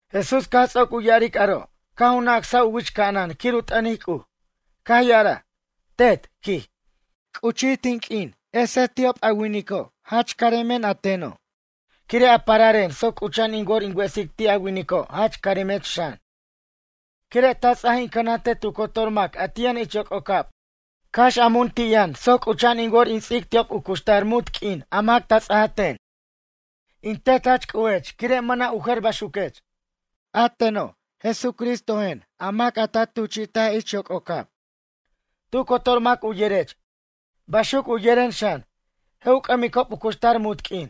Jesús caj ts'oc u ya'aric aro' caj u nacsaj u wich ca'anan quir u t'ʌnic C'uj. Caj ya'araj: ―Tet ―quij―, c'uchij tin q'uin esej ti'ob a winico' jach caremen a teno' quire' a pararen soc c'ucha'an in wor in wesic ti' a winico' jach caremech xan. Quire' ta ts'aj in cʌnantej tu cotor mac a ti' yʌn ich yoc'ocab cax a mun ti' yʌn soc c'ucha'an in wor in ts'ic ti'ob u cuxtar muntq'uin a mac ta ts'aja ten. In Tet jach C'ujech quire' mʌna' u jer baxuquech. A teno' Jesucristojen a mac a ta tuchi'taj ich yoc'ocab. Tu cotor mac u yerech, baxuc u yeren xan. Je' u c'ʌmicob u cuxtar munt q'uin.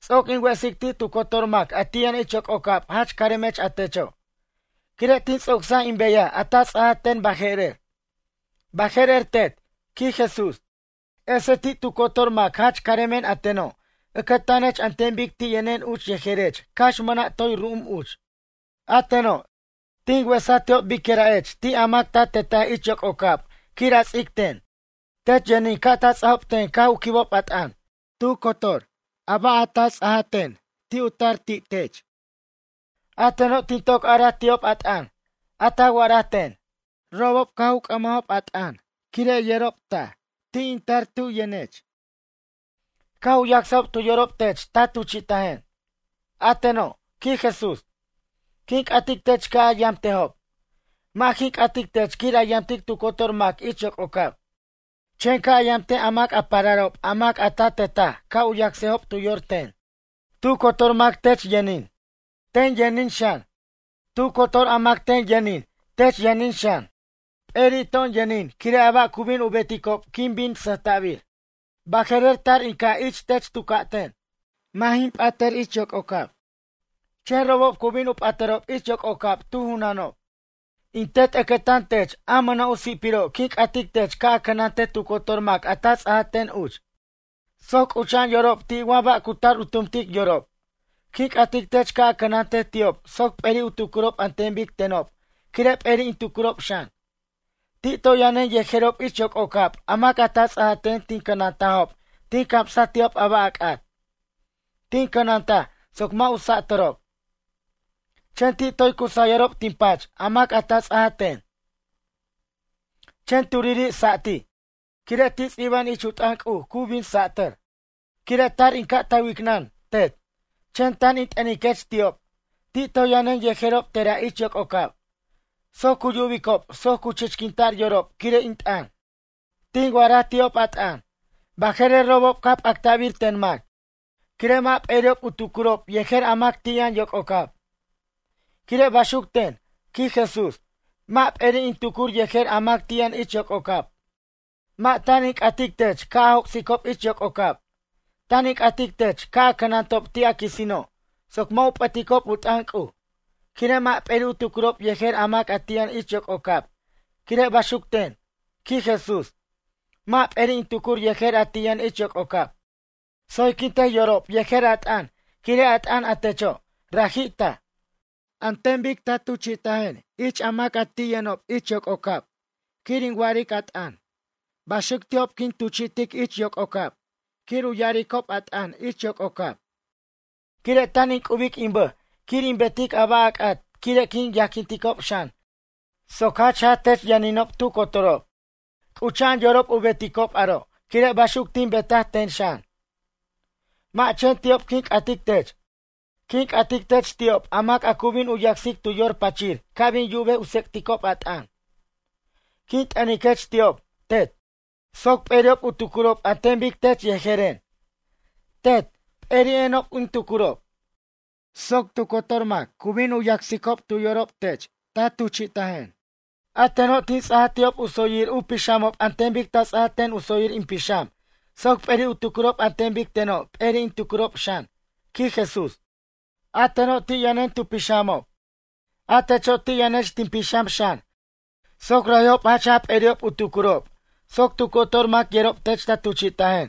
’Ts'oc in wesic ti' tu cotor mac a ti' yʌn ich yoc'ocab jach caremech a techo'. Quire' tin ts'ocsaj in beyaj a ta ts'aja ten baje'rer. Baje'rer Tet ―quij Jesús―, esej ti' tu cotor mac jach caremen a teno' ʌcʌtanech an ten bic ti' yʌnen uch yejerech cax mʌna' toy ru'um uch. ’A teno', tin wesaj ti'ob bicyʌra'ech ti' a mac ta tetaj ich yoc'ocab quir a ts'ic ten. Tech yʌnin ca' ta ts'ajob ten caj u quibob a t'ʌn. Tu cotor ba' a ta ts'aja ten u tar ti' tech in Tetech. A teno' tin toc araj ti'ob a t'ʌn, a ta wa'araj ten. Robob caj u c'ʌmajob a t'ʌn quire' yerob taj, ti' in tar tub yʌnech. Caj u yacsajob tu yorob tech ta tuchi'tajen. ’A teno' ―quij Jesús―, quin c'atic tech ca' a yamtejob. Mʌ' jin c'atic tech quir a yamtic tu cotor mac ich yoc'ocab. Chen ca' a yamtej a mac a pararob a mac a ta tetaj ca' u yacsejob tu yor ten. Tu cotor mac tech yʌnin, ten yʌnin xan. Tu cotor a mac ten yʌnin tech yʌnin xan. P'eri' to'on yʌnin quire' a ba' cu bin u beticob quin bin sʌjta'bir. ’Baje'rer tar in ca' ich tech tu ca'ten. Mʌ' jin p'atʌr ich yoc'ocab. Chen robob cu bin u p'atʌrob ich yoc'ocab tu junanob. In Tet ʌcʌtan tech a mʌna' u si'piro' quin c'atic tech ca' a cʌnantej tu cotor mac a ta ts'aj ten uch. Soc c'ucha'an yorob ti' wa ba' cu tar u tumtic yorob. Quin c'atic tech ca' a cʌnantej ti'ob soc p'eri' u tucurob an ten bic tenob quire' p'eri' in tucurob xan. Ti' toy yʌnen yejerob ich yoc'ocab a mac a ta ts'aja ten tin cʌnantajob tin camsaj ti'ob a ba' a c'at. Tin cʌnantaj soc mʌ' u satʌrob. Chen ti' toy cu sayʌrob tin pach a mac a ta ts'aja ten. Chen turiri' satij. Quire' ti' ts'iba'an ich u t'ʌn C'uj cu bin satʌr. ’Quire' tar in ca' ta wicnʌn, Tet. Chen tan in t'ʌniquech ti'ob, ti' toy yʌnen yejerob tera' ich yoc'ocab. Soc cu yubicob soc cu chichquinta'r yorob quire' in t'ʌn. Tin wa'araj ti'ob a t'ʌn. Baje'rer robob caj p'actabir ten mac. Quire' mʌ' p'eri'ob u tucurob yejer a mac ti' yʌn yoc'ocab. Quire' baxuc ten ―quij Jesús―, mʌ' p'eri' in tucur yejer a mac ti' yʌn ich yoc'ocab. Mʌ' tan in c'atic tech ca' a joc'sicob ich yoc'ocab. Tan in c'atic tech ca' a cʌnantob ti' a quisino' soc mʌ' u p'ʌticob u t'ʌn C'uj. Quire' mʌ' p'eri' u tucurob yejer a mac ti' yʌn ich yoc'ocab quire' baxuc ten ―quij Jesús―, mʌ' p'eri' in tucur yejer a ti' yʌn ich yoc'ocab. Tsoyquintej yorob yejer a t'ʌn quire' a t'ʌn a techo', raji' taj. An ten bic ta tuchi'tajen ich a mac a ti' yʌnob yoc'ocab quir in wa'aric a t'ʌn. Baxuc ti'ob quin tuchi'tic ich yoc'ocab quir u ya'aricob a t'ʌn yoc'ocab. Quire' tan in c'ubic in bʌj quir in betic a ba' a c'at quire' quin yajquinticob xan soc jach jaj tech yʌninob tu cotorob. C'ucha'an yorob u beticob aro' quire' baxuc tin betaj ten xan. ’Mʌ' chen ti'ob quin c'atic tech, quin c'atic tech ti'ob a mac a cu bin u yacsic tu yor pachir ca' bin yubej u tsec'ticob a t'ʌn. Quin t'ʌniquech ti'ob, Tet, soc p'eri'ob u tucurob an ten bic tech yejeren, Tet, p'eri'enob in tucurob. Soc tu cotor mac cu bin u yacsicob tu yorob tech ta tuchi'tajen. A teno' tin ts'aja ti'ob u tsoyir u pixamob an ten bic ta ts'ajten u tsoyir in pixam soc p'eri' u tucurob an ten bic tenob p'eri' in tucurob xan ―quij Jesús―. A teno' ti' yʌnen tu pixamob, a techo' ti' yʌnech tin pixam xan soc raji'ob jach jaj p'eri'ob u tucurob soc tu cotor mac yerob tech ta tuchi'tajen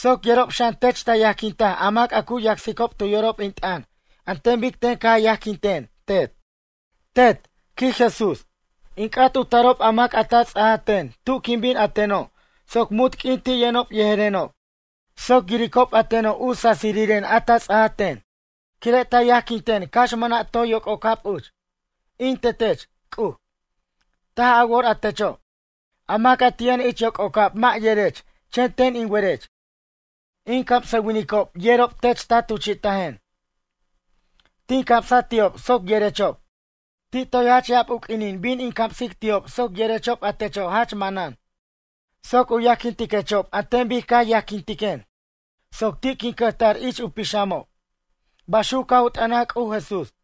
soc yerob xan tech ta yajquintaj a mac a cu yacsicob tu yorob in t'ʌn an ten bic ten ca yajquintiquen, Tet. ’Tet ―quij Jesús―, in c'at u tarob a mac a ta ts'aja ten tu' quin bin a teno' soc munt q'uin ti' yʌnob yejerenob. Soc yiricob a teno' u sasiriren a ta ts'aja ten quire' ta yajquinten cax mʌna' toy yoc'ocab uch. In Tetech, C'uj, taj a wor a techo'. A mac a ti' yʌn ich yoc'ocab mʌ' yerech chen ten in werech. In camsʌwinicob yerob tech ta tuchi'tajen. Tin camsaj ti'ob soc yerechob. Ti' toy jach ya'ab u q'uinin bin in camsic ti'ob soc yerechob a techo' jach manan. Soc u yajquintiquechob an ten bic ca yajquintiquen soc ti' quin cʌjtar ich u pixamob, ―baxuc caj u t'ʌnaj C'uj Jesús.